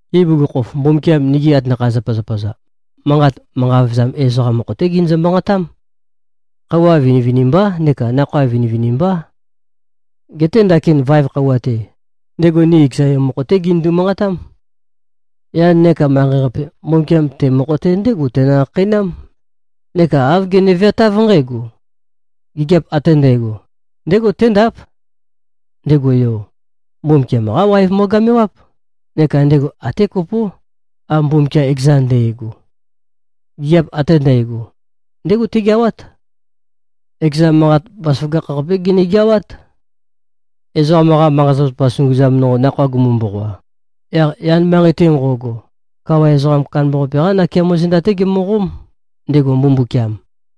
Ibugukhokhof, Mbumbukiam nigi atanakha-zapazapa-za, manqat, manqa vevezam ezoqam mokho-té genøzø-manqatám. Khøuwa vinivinimbá neka nakhoa vinivinimbá. Geté ndakin vaev khøuwa-te, ndego ni ekeza Yo mokho-té ginindu-manqatám. Yan neka manqei-qape, Mbumbukiam te mokho-te ndégo tenø-khakheinám neka āv gene-veatáv nqǽgo: Gigiap ate ndægo, ndégo téndáp. Ndego Yo, Mbumbukiam-qá waev mo꞉gamewáp, neka ndego até kopó, av Mbumbukiam ekezan nde꞉go. Gigiap ate ndægo, ndégo tegeawát. Ekeza manqat bazaføgakh-qapé genegeawát. Ezoqam-qa manqa-zapazapa sunguzam nonqo, nakhoa gumu-mboqoa, yaq yan manqei-te nqo꞉go, Kawa ezoqam kandambaqape-qá nakeamo zenda-té gemøqóm, ndego Mbumbukiam.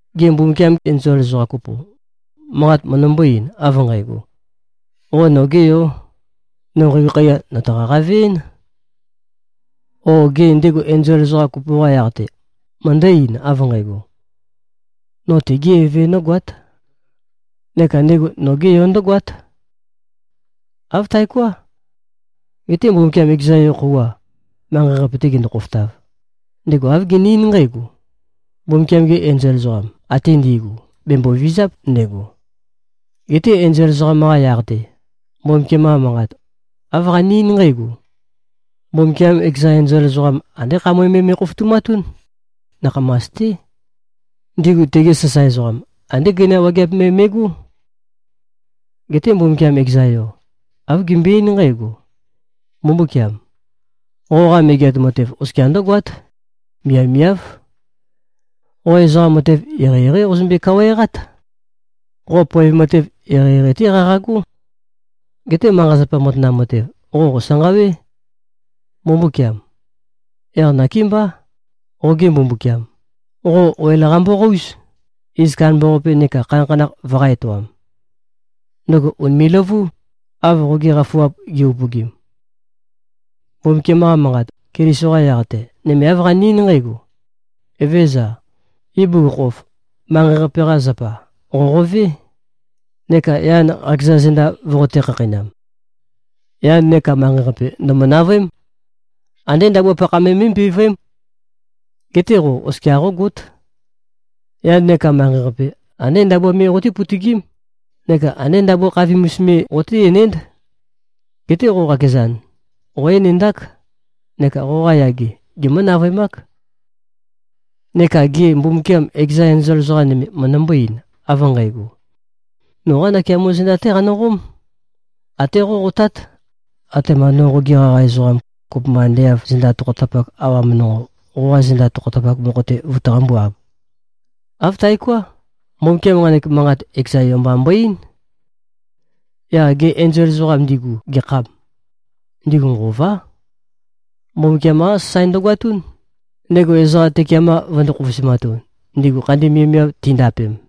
Gê, Mbumbukiam enzol ezoqa kopo, manqat møndømbó-ein, av nqægo, “Qo nogē yō. No nqægo khaiya, nø̀taqa-qave-ēn”? O gê, ndego enzol ezoqam kopo-qa yaq-te, møndǽ-ein, av nqægo, “No tegē eve nōgoāt, neka ndego nogē yo ndø̄goāt”? Āv taoká. Geté Mbumbukiam ekeza yo-khøuwa, manqei-qape-te gendo-khofotav, ndego āv gene-eín nqǽgo, “Mbumbukiam-gi enzol ezoqam ate ndi꞉gu, bèmbovizáp, ndego.” Geté enzol ezoqam-qa yaq-te, Mbumbukiam-qa Manqat, āv qane-eín nqǽgo, “Mbumbukiam ekeza enzol ezoqam, andé khamøe me me꞉khofotumatún. Nakhamas-té. Ndigu tegi sasae ezoqam, andé gøina wageap me me꞉gó.” Geté Mbumbukiam ekeza Yo, āv gembøe-eín nqǽgo, “Mbumbúkiam! Qoqa megeat matev, oskia ndǿgoát. Miavmiáv. Qo ezoqa matev eqeieqeí qozømbe-kawaeqát.” Qo poev, matev eqeieqei-té qaqagó. Geté manqa-zapa matanam matev, qo qòsanqawé. Mbumbúkiam! Yaq nakémbá, qoge Mbumbukiam, qo oil qamboqóuz, iz kandambaqape neka khanakhanakh vøqā-etoam. Ndøgo ùnime꞉-løvú, av qogi qafuap gi꞉-upøgim. Mbumbukiam-qa Manqat, Keliso-qa yaq-te, nøme āv qane-eín nqǽgo, “Evézøza! Ibugukhokhof, manqei-qape-qa zapa, qo qové, neka yan qakeza zenda voqotē-khakheinam. Yan neka manqei-qape, ndø̀mø-navøém. Andé ndabua pakha me mé꞉mbevøém. Geté qo oskia qógót. Yan neka manqei-qape, andé ndabua me qoté-putøgím neka andé ndabua khavim-us me qoté-enénd. Geté qo qakezan, qó-enendák, neka qoqa yage, gemǿ-navøemák.” Neka, gê, Mbumbukiam ekeza enzol ezoqa nøme, møndømbó-ein, av nqægo, “Noqá nakeamo zenda-té qanøqóm. Até qóqotát, atema no qogi qaqa ezoqam, kopømba ande av zenda tokhotapak awam nonqo, qoqa zenda tokhotapak mokho-te vøtaqambú-āb.”? Āv taoká. Mbumbukiam nqanek manqat, ekeza yo mba mbo-eín. Yaq gê, enzol ezoqam, ndigu gekhâm? Ndigu nqová. Mbumbukiam-qá sasae ndøgoatún, ndego ezoqa tøkeam-qa vøndō-khofosumatun, ndigu khandi miavmiav tindapem.